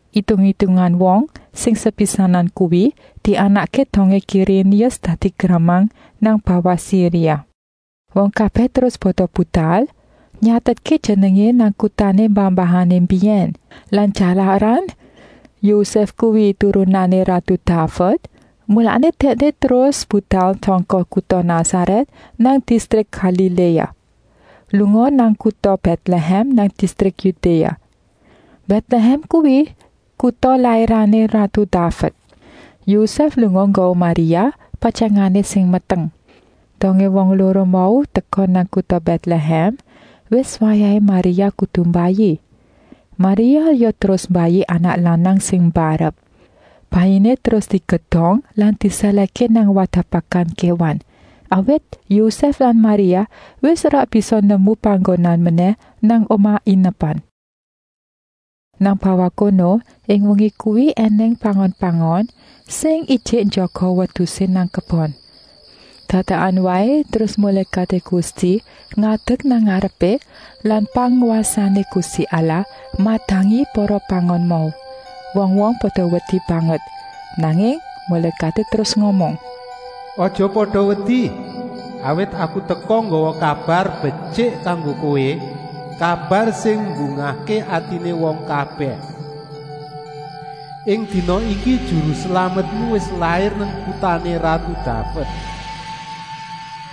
Itung-itungan wong sing sepisanan kuwi dianakké dongé Kirénius dadi gramang nang bawah Siria. Wong kabèh terus pada budal nyatetké jenengé nang kutané mbah-mbahané mbiyèn. Lan jalaran Yosèf kuwi turunané ratu Daved, mulané dèkné ya terus budal sangka kuta Nasarèt nang distrik Galiléa, lunga nang kuta Bètlehèm nang distrik Yudéa. Bètlehèm kuwi kuta lairané ratu Daved. Yosèf lunga nggawa Maria, patyangané sing meteng. Dongé wong loro mau teka nang kuta Bètlehèm wis wayahé Maria kudu mbayi. Maria ya terus mbayi anak lanang sing mbarep. Bayiné terus digedong lan disèlèhké nang wadah pakan kéwan, awit Yosèf lan Maria wis ora bisa nemu panggonan menèh nang omah inepan. Nang bawah kono ing wengi kuwi ènèng pangon-pangon sing ijik njaga wedusé nang kebon. Dadakan waé terus mulékaté Gusti ngadek nang ngarepé lan pangwasané Gusti Allah madangi para pangon mau. Wong-wong pada wedi banget. Nanging mulékaté terus ngomong: “Aja pada wedi, awit aku teka nggawa kabar betyik kanggo kowé, kabar sing mbungahké atiné wong kabèh. Ing dina iki Juru Slametmu wis lair nang kutané ratu Daved.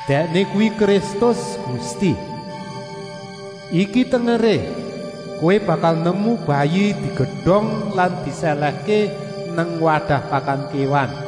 Dèkné kuwi Kristus, Gusti. Iki tengeré: kowé bakal nemu bayi digedong lan disèlèhké nang wadah pakan kéwan!”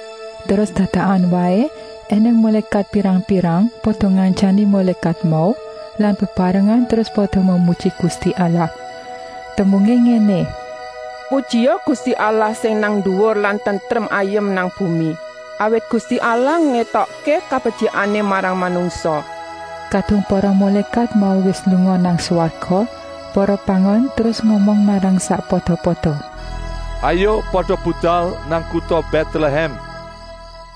Terus dadakan waé ènèng mulékat pirang-pirang pada ngantyani mulékat mau lan bebarengan terus pada memuji Gusti Allah. Tembungé ngéné: “Pujia Gusti Allah sing nang nduwur lan tentrem ayem nang bumi, awit Gusti Allah ngétokké kabetyikané marang manungsa.” Kadung para mulékat mau wis lunga nang swarga, para pangon terus ngomong marang sakpada-pada: “Hayuk pada budal nang kuta Bètlehèm.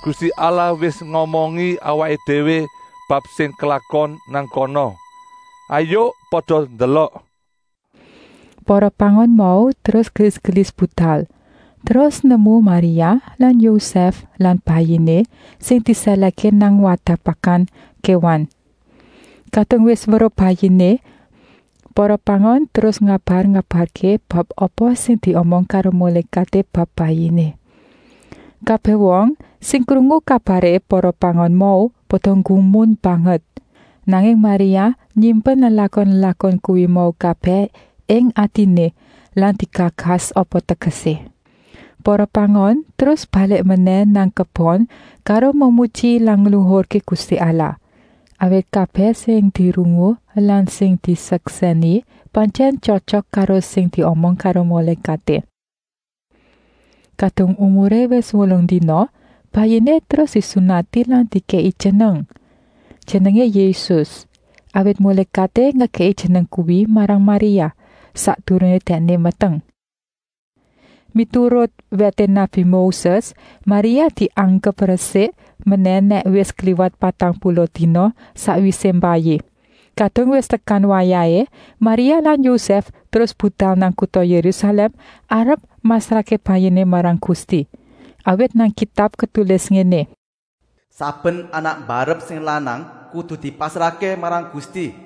Gusti Allah wis ngomongi awaké déwé bab sing klakon nang kana. Hayuk pada ndelok!” Para pangon mau terus gelis-gelis budal, terus nemu Maria lan Yosèf lan Bayiné sing disèlèhké nang wadah pakan kéwan. Kadung wis weruh Bayiné, para pangon terus ngabar-ngabarké bab apa sing diomong karo mulékaté bab Bayiné. Kabèh wong sing krungu kabaré para pangon mau pada nggumun banget. Nanging Maria nyimpen lelakon-lelakon kuwi mau kabèh ing atiné lan digagas apa tegesé. Para pangon terus balik menèh nang kebon karo memuji lan ngluhurké Gusti Allah, awit kabèh sing dirungu lan sing diseksèni pantyèn tyotyok karo sing diomong karo mulékaté. Kadung umuré wis wolung dina, Bayiné terus disunati lan dikèki jeneng. Jenengé Yésus, awit mulékaté ngekèki jeneng kuwi marang Maria, sakdurungé dèkné meteng. Miturut wèté nabi Moses Maria dianggep resik menèh nèk wis kliwat patang puluh dina sakwisé mbayi. Kadung wis tekan wayahé, Maria lan Yosèf terus budal nang kuta Yérusalèm arep masrahké Bayiné marang Gusti. Awit nang Kitab ketulis ngéné: “Saben anak mbarep sing lanang kudu dipasrahké marang Gusti.”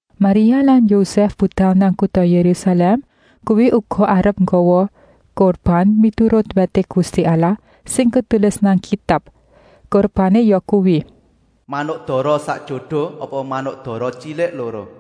Maria lan Yosèf budal nang kuta Yérusalèm kuwi uga arep nggawa kurban miturut wèté Gusti Allah sing ketulis nang Kitab. Kurbané yakuwi: manuk dara sak jodo apa manuk dara tyilik loro.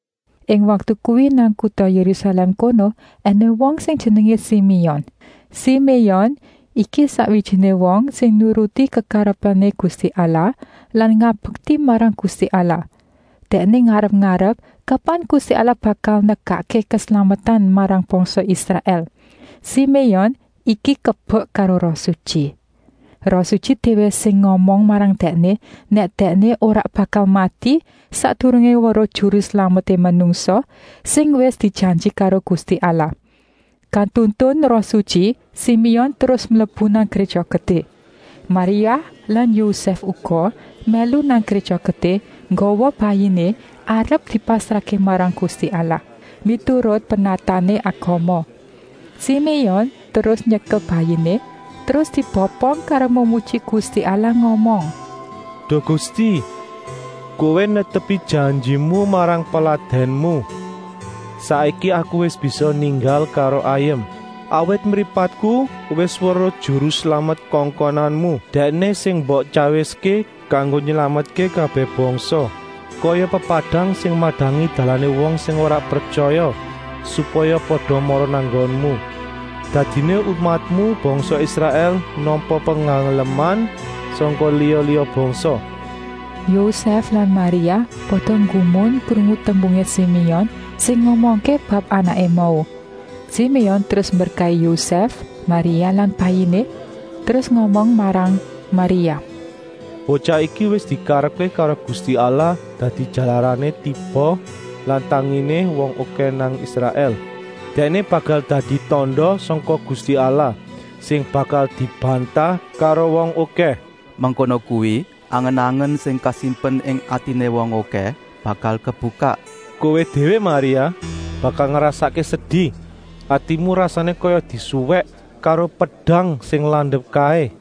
Ing waktu kuwi nang kuta Yérusalèm kono ènèng wong sing jenengé Siméon. Siméon iki sakwijiné wong sing nuruti kekarepané Gusti Allah lan ngabekti marang Gusti Allah. Dèkné ngarep-arep kapan Gusti Allah bakal nekakké keslametan marang bangsa Israèl. Siméon iki kebek karo Roh Sutyi. Roh Sutyi déwé sing ngomong marang dèkné nèk dèkné ora bakal mati sakdurungé weruh Juru Slameté manungsa, sing wis dijanji karo Gusti Allah. Katuntun Roh Sutyi Siméon terus mlebu nang Gréja Gedé. Maria lan Yosèf uga mlebu nang Gréja Gedé nggawa Bayiné arep dipasrahké marang Gusti Allah, miturut pernatané agama. Siméon terus nyekel Bayiné, terus dibopong karo memuji Gusti Allah ngomong: “Duh Gusti, Kowé netepi janjimu marang peladènmu. Saiki aku wis bisa ninggal karo ayem. Awit mripatku wis weruh Juru Slamet Kongkonanmu. Dèkné sing mbok tyawiské kanggo nylametké kabèh bangsa, kaya pepadang sing madangi dalané wong sing ora pretyaya, supaya pada mara nang nggonmu. Dadiné umatmu, bangsa Israèl, nampa pengaleman sangka liya-liya bangsa.” Yosèf lan Maria pada nggumun krungu tembungé Siméon sing ngomongké bab anaké mau. Siméon terus mberkahi Yosèf, Maria lan Bayiné, terus ngomong marang Maria: “Botyah iki wis dikarepké karo Gusti Allah dadi jalarané tiba lan tanginé wong okèh nang Israèl. Dèkné bakal dadi tanda sangka Gusti Allah, sing bakal dibantah karo wong okèh. Mengkono kuwi angen-angen sing kasimpen ing atiné wong okèh bakal kebukak. Kowé déwé Maria, bakal ngrasakké sedi, atimu rasané kaya disuwèk karo pedang sing landep kaé.”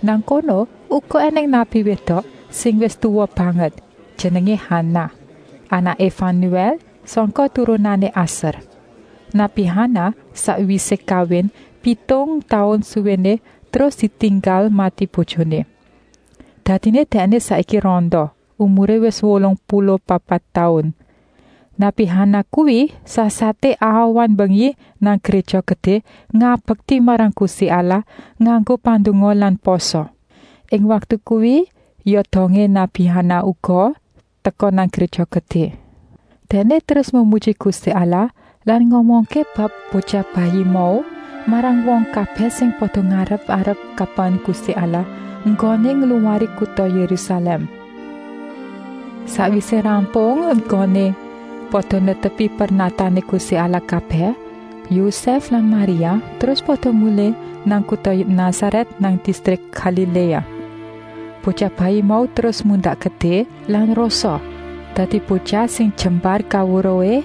Nang kono uga ènèng nabi wédok sing wis tuwa banget, jenengé Hanah, anaké Fanuèl sangka turunané Aser. Nabi Hanah sakwisé kawin pitung taun suwéné terus ditinggal mati bojoné. Dadiné dèkné saiki randa, umuré wis wolung puluh papat taun. Nabi Hanah kuwi sasaté awan-wengi nang Gréja Gedé ngabekti marang Gusti Allah nganggo pandonga lan pasa. Ing waktu kuwi ya dongé nabi Hanah uga teka nang Gréja Gedé. Dèkné terus memuji Gusti Allah lan ngomongké bab Botyah Bayi mau marang wong kabèh sing pada ngarep-arep kapan Gusti Allah enggoné ngluwari kuta Yérusalèm. Sakwisé rampung enggoné pada netepi pernatané Gusti Allah kabèh, Yosèf lan Maria terus pada mulih nang kuta Nasarèt nang distrik Galiléa. Botyah Bayi mau terus mundak gedé lan rosa, dadi botyah sing jembar kaweruhé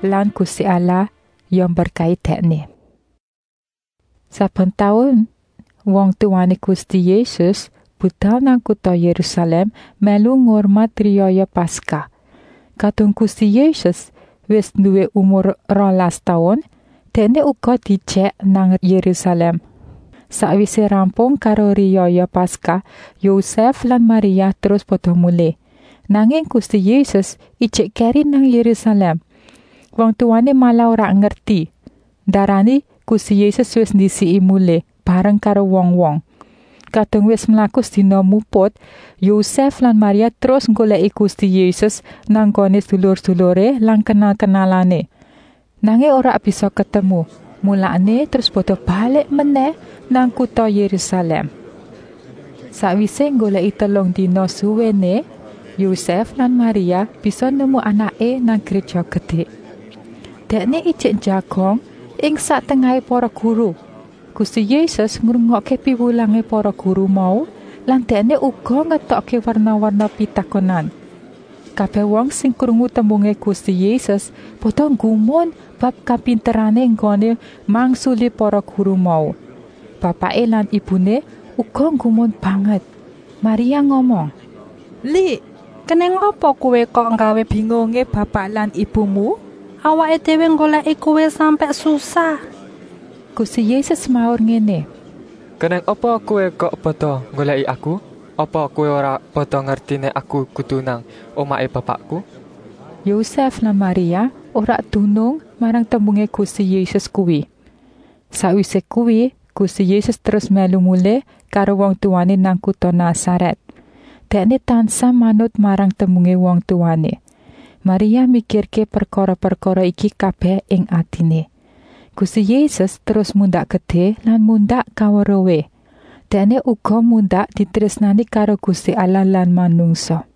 lan Gusti Allah ya mberkahi Dèkné. Saben taun wong tuwané Gusti Yésus budal nang kuta Yérusalèm mèlu ngurmat riyaya Paskah. Kadung Gusti Yésus wis nduwé umur rolas taun, Dèkné uga diejèk nang Yérusalèm. Sakwisé rampung karo riyaya Paskah Yosèf lan Maria terus pada mulih, nanging Gusti Yésus ijik kèri nang Yérusalèm. Wong tuwané malah ora ngerti Ndarani Gusti Yésus wis ndisiki mulih, bareng karo wong-wong. Kadung wis mlaku sedina muput, Yosèf lan Maria terus nggolèki Gusti Yésus nang nggoné sedulur-seduluré lan kenal-kenalané. Nanging ora bisa ketemu, mulané terus pada balik menèh nang kuta Yérusalèm. Sakwisé nggolèki telung dina suwéné, Yosèf lan Maria bisa nemu Anaké nang Gréja Gedé. Dèkné ijik njagong ing sak tengahé para guru. Gusti Yésus ngrungokké piwulangé para guru mau lan Dèkné uga ngetokké werna-werna pitakonan. Kabèh wong sing krungu tembungé Gusti Yésus pada nggumun bab kapinterané enggoné mangsuli para guru mau. Bapaké lan ibuné uga nggumun banget. Maria ngomong: “Lik, kenèng apa kowé kok nggawé bingungé bapak lan ibumu? Awaké déwé nggolèki kowé sampèk susah.” Gusti Yésus semaur ngéné: “Kenèng apa kowé kok pada nggolèki Aku? Apa kowé ora pada ngerti nèk Aku kudu nang omahé Bapakku?” Yosèf lan Maria ora dunung marang tembungé Gusti Yésus kuwi. Sakwisé kuwi Gusti Yésus terus mèlu mulih karo wong tuwané nang kuta Nasarèt. Dèkné tansah manut marang tembungé wong tuwané. Maria mikirké prekara-prekara iki kabèh ing atiné. Gusti Yésus terus mundak gedé lan mundak kaweruhé. Dèkné uga mundak ditrésnani karo Gusti Allah lan manungsa.